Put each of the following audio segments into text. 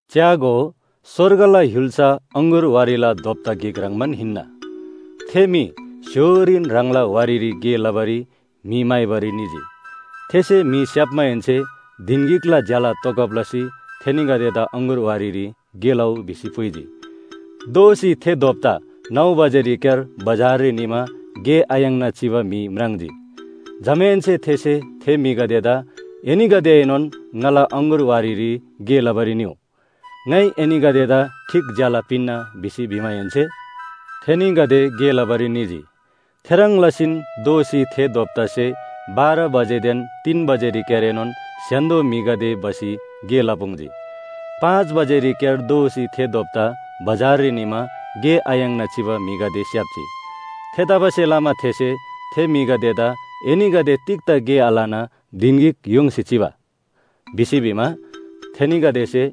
“च्‍यागो, स्‍वर्गला य्‍हुल्‍सा अङगुर वारीला दोप्‍ता गिक ह्रङ्‌बान हिन्‍ना। थे म्‍हि स्‍य्‍होरीन ह्राङला वारीरी गे लबारी म्‍हि म्‍हाइबारी निजी। थेसे म्‍हि स्‍याप्‍माहेन्‍से धिन गिकला ज्‍याला तोगब लसी थेनीगदेदा अङगुर वारीरी गे लउ भिसी पुइजी। “दोःसी थे दोप्‍ता नौ बजेरीक्‍यार बजाररी निमा गे आयाङ्ना चिबा म्‍हि म्राङ्जी। जमाहेन्‍से थेसे थे म्‍हिगदेदा ‘एनीगदेएनोन ङाला अङगुर वारीरी गे लबारी निउ। ङाइ एनीगदेदा ठीक ज्‍याला पिन्‍ना’ भिसी भिमाहेन्‍से, थेनीगदे गे लबारी निजी। “थेह्रङ् लसीन दोःसी थे दोप्‍तासे बाह्र बजेदेन तीन बजेरीक्‍यारएनोन स्‍य्‍हान्‍दो म्‍हिगदे भसी गे लपुङ्जी। “पाँच बजेरीक्‍यार दोःसी थे दोप्‍ता बजाररी निमा गे आयाङ्ना चिबा म्‍हिगदे स्‍याप्‍जी। थेतबासेलमा थेसे थे म्‍हिगदेदा ‘एनीगदे तिग्‍दा गे आलना धिन गिक य्‍होङ्सी चिबा?’ भिसी भिमा, थेनीगदेसे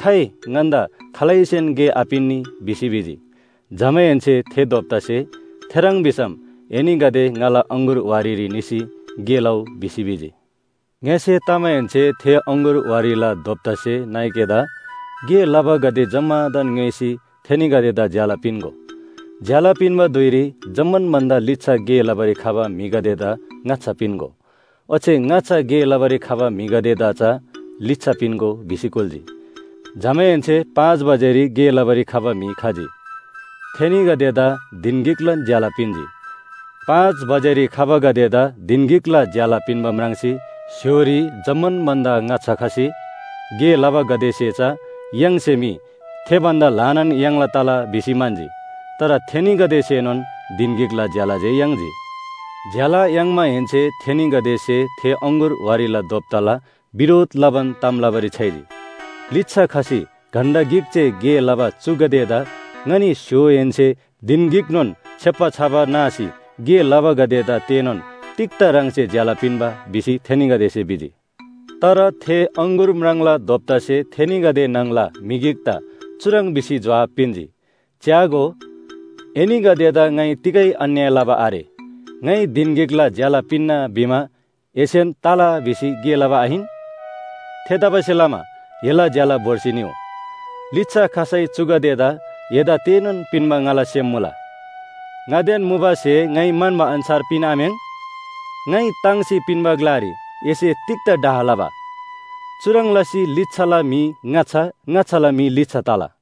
‘खाइ ङन्‍दा खालैसेन गे आपिन्‍नी’ भिसी भिजी। जमाहेन्‍से थे दोप्‍तासे ‘थेह्रङ् भिसम एनीगदे ङाला अङगुर वारीरी निसी गे लउ’ भिसी भिजी। “ङ्‍यसे तमाहेन्‍से थे अङगुर वारीला दोप्‍तासे नाइकेदा ‘गे लबागदे जम्‍मादान ङ्‌योइसी थेनीगदेदा ज्‍याला पिन्‍गो। ज्‍याला पिन्‍बा धुइरी जम्‍मान भन्‍दा लिच्‍छा गे लबारी खबा म्‍हिगदेदा ङाच्‍छा पिन्‍गो, ओच्‍छे ङाच्‍छा गे लबारी खबा म्‍हिगदेदा चा लिच्‍छा पिन्‍गो’ भिसी कुल्‍जी। जमाहेन्‍से पाँच बजेरी गे लबारी खबा म्‍हि खजी। थेनीगदेदा धिन गिकलान ज्‍याला पिन्‍जी। पाँच बजेरी खबागदेदा धिन गिकला ज्‍याला पिन्‍बा म्राङ्सी स्‍य्‍होरी जम्‍मान भन्‍दा ङाच्‍छा खसी गे लबागदेसे चा य्‍हाङसे मी थे भन्‍दा ल्‍हानान याङ्ला तला भिसी म्‍हन्‍जी। तर थेनीगदेसेनोन धिन गिकला ज्‍याला जे याङ्जी। ज्‍याला याङ्माहेन्‍से थेनीगदेसे थे अङगुर वारीला दोप्‍ताला बिरोध लबान ताम लबारी छ्‌याइजी। ‘लिच्‍छा खसी घण्‍टा गिक जे गे लबा चुगदेदा ङनी स्‍य्‍होहेन्‍से धिन गिकनोन छेप्‍बा छबा नासी गे लबागदेदा तेनोन तिग्‍दा ह्राङसे ज्‍याला पिन्‍बा’ भिसी थेनीगदेसे भिजी, “तर थे अङगुर म्राङ्ला दोप्‍तासे थेनीगदे न्‍हङला म्‍हि गिकदा चुह्रङ् भिसी जोहाब पिन्‍जी, ‘च्‍यागो, एनीगदेदा ङाइ तिगै अन्‍याय लबा आरे। ङाइ धिन गिकला ज्‍याला पिन्‍ना भिमा एसेन तला भिसी गे लबा आहिन? थेतबासेलमा एला ज्‍याला भोर्सी निउ। लिच्‍छा खसै चुगदेदा एदा तेनोन पिन्‍बा ङाला सेम मुला। ङादेन मुबा स्‍हे ङाइ म्‍हन्‍बा अन्‍छार पिन्‍आम्‍याङ्? ङाइ ताङ्सी पिन्‍बा ग्‍लारी एसे तिग्‍दा डाह लबा?’ “चुह्रङ् लसी लिच्‍छाला म्‍हि ङाच्‍छा, ङाच्‍छाला म्‍हि लिच्‍छा तला।”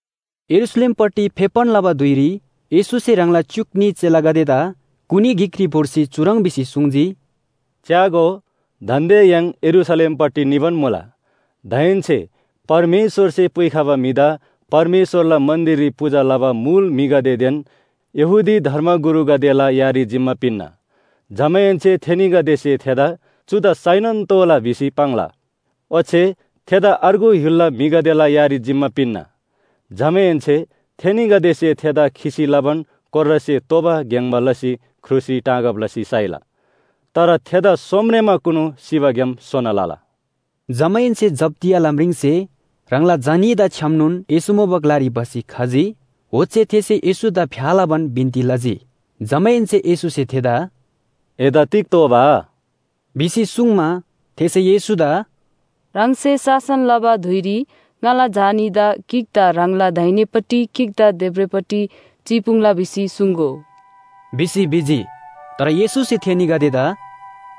यरूशलेमपट्टि फेप्‍बान लबा धुइरी येशूसे ह्राङला च्‍युक न्‍ही चेलागदेदा कुनी गिकरी भोर्सी चुह्रङ् भिसी सुङ्जी, “च्‍यागो, दान्‍दे य्‍हाङ यरूशलेमपट्टि निबान मुला। दाहेन्‍से परमेश्‍वरसे पुइखबा म्‍हिदा परमेश्‍वरला मन्‍दिररी पूजा लबा मुल म्‍हिगदेदेन यहूदी धर्मगुरुगदेला यारी जिम्‍मा पिन्‍ना। जमाहेन्‍से थेनीगदेसे थेदा ‘चुदा साइनोन तोःला’ भिसी पाङ्ला। ओच्‍छे थेदा अर्गु य्‍हुलला म्‍हिगदेला यारी जिम्‍मा पिन्‍ना। जमाहेन्‍से थेनीगदेसे थेदा खिसी लबान कोर्रासे तोबा ग्‍याङ्‍बा लसी क्रुसरी टाँगब लसी साइला। तर थेदा सोमरेमाकुनु सिबाग्‍याम सोना लला।” जमाहेन्‍से जब्‍दियाला म्रिङसे ह्राङला झा न्‍हीदा छ्‌यामनोन येशू मुबा ग्‍लारी भसी खजी। ओच्‍छे थेसे येशूदा फ्‍या लबान बिन्‍ती लजी। जमाहेन्‍से येशूसे थेदा “एदा तिग तोःबा?” भिसी सुङ्मा, थेसे येशूदा “ह्राङसे शासन लबा धुइरी ङाला झा न्‍हीदा गिकदा ह्राङला दाहिनेपट्टि गिकदा देब्रेपट्टि चिपुङ्ला भिसी सुङ्‍गो” भिसी भिजी। तर येशूसे थेनीगदेदा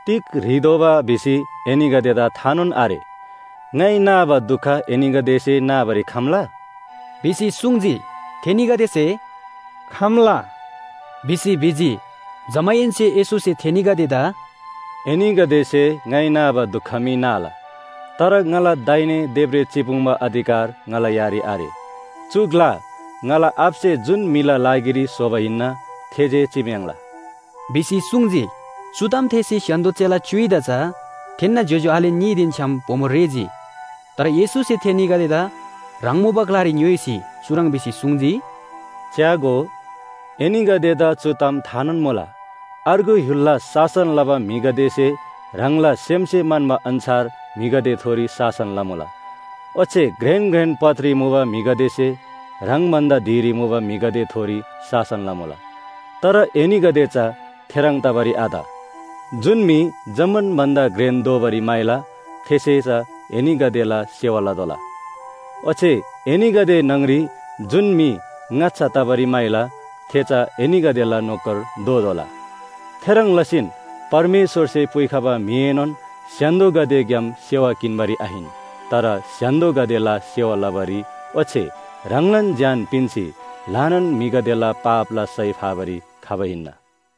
“तिग ह्रीदोबा भिसी एनीगदेदा थानोन आरे। ङाइ नाबा दुख एनीगदेसे नाबारी खम्‍ला?” भिसी सुङ्जी। थेनीगदेसे “खम्‍ला” भिसी भिजी। जमाहेन्‍से येशूसे थेनीगदेदा “एनीगदेसे ङाइ नाबा दुख मी नाला। तर ङाला दाहिने देब्रे चिपुङ्बा अधिकार ङाला यारी आरे। चु ग्‍ला ङाला आबासे जुन म्‍हिला लागिरी स्‍होबा हिन्‍ना थे जे चिम्‍याङ्ला” भिसी सुङ्जी। चु ताम थेःसी स्‍य्‍हान्‍दो चेला च्‍युइदा चा थेन्‍ना ज्‍योज्‍यो आले न्‍हीदेन छ्‌याम बोमो रेःजी। तर येशूसे थेनीगदेदा ह्राङ मुबा ग्‍लारी ङ्‌योइसी चुह्रङ् भिसी सुङ्जी, “च्‍यागो, एनीगदेदा चु ताम थानोन मुला, अर्गु य्‍हुलला शासन लबा म्‍हिगदेसे ह्राङला सेमसे म्‍हन्‍बा अन्‍छार म्‍हिगदेथोरी शासन लमुला। ओच्‍छे घ्रेन घ्रेन पदरी मुबा म्‍हिगदेसे ह्राङ भन्‍दा धिरी मुबा म्‍हिगदेथोरी शासन लमुला। तर एनीगदे चा थेह्रङ् तबारी आत। जुन म्‍हि जम्‍मान भन्‍दा घ्रेन दोबारी म्‍हाइला थेसे चा एनीगदेला सेवा लतोःला। ओच्‍छे एनीगदे न्‍हङ‍री जुन म्‍हि ङाच्‍छा तबारी म्‍हाइला थे चा एनीगदेला नोकर दोतोःला। थेह्रङ् लसीन परमेश्‍वरसे पुइखबा म्‍हिएनोन स्‍य्‍हान्‍दोगदेग्‍याम सेवा किन्‍बारी आहिन, तर स्‍य्‍हान्‍दोगदेला सेवा लबारी ओच्‍छे ह्राङलान ज्‍यान पिन्‍सी ल्‍हानान म्‍हिगदेला पापला सय फाबारी खबा हिन्‍ना।”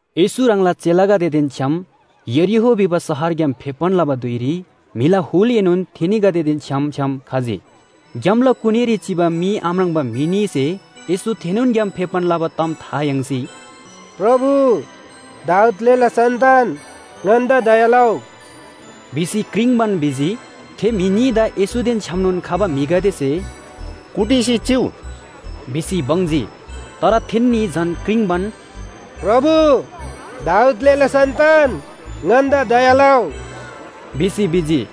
येशू ह्राङला चेलागदेदेन छ्‌याम यरीहो भिबा शहरग्‍याम फेप्‍बान लबा धुइरी म्‍हिला हुलएनोन थेनीगदेदेन छ्‌याम छ्‌याम खजी। ग्‍यामला कुनीरी चिबा मी आम्राङ्बा म्‍हि न्‍हीसे येशू थेनोन ग्‍याम फेप्‍बान लबा ताम था याङ्सी “प्रभु, दाऊद ग्‍लेला सन्‍तान! ङन्‍दा दया लउ” भिसी क्रिङ्बान भिजी। थे म्‍हि न्‍हीदा येशूदेन छ्‌यामनोन खबा म्‍हिगदेसे “कुटिसी चिउ” भिसी बङ्जी। तर थेन्‍नी झन क्रिङ्बान, “प्रभु, दाऊद ग्‍लेला सन्‍तान ङन्‍दा दया लउ” भिसी भिजी।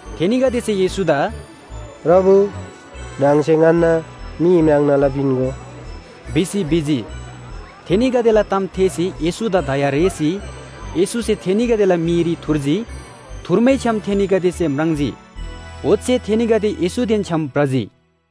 थेनीगदेसे येशूदा “प्रभु ह्राङसे ङन्‍ना मी म्राङ्ना लपिन्‍गो” भिसी भिजी। थेनीगदेला ताम थेःसी येशूदा दया रेःसी येशूसे थेनीगदेला मीरी थुर्जी। थुर्मैछ्‌याम थेनीगदेसे म्राङ्जी। ओच्‍छे थेनीगदे येशूदेन छ्‌याम भ्रजी।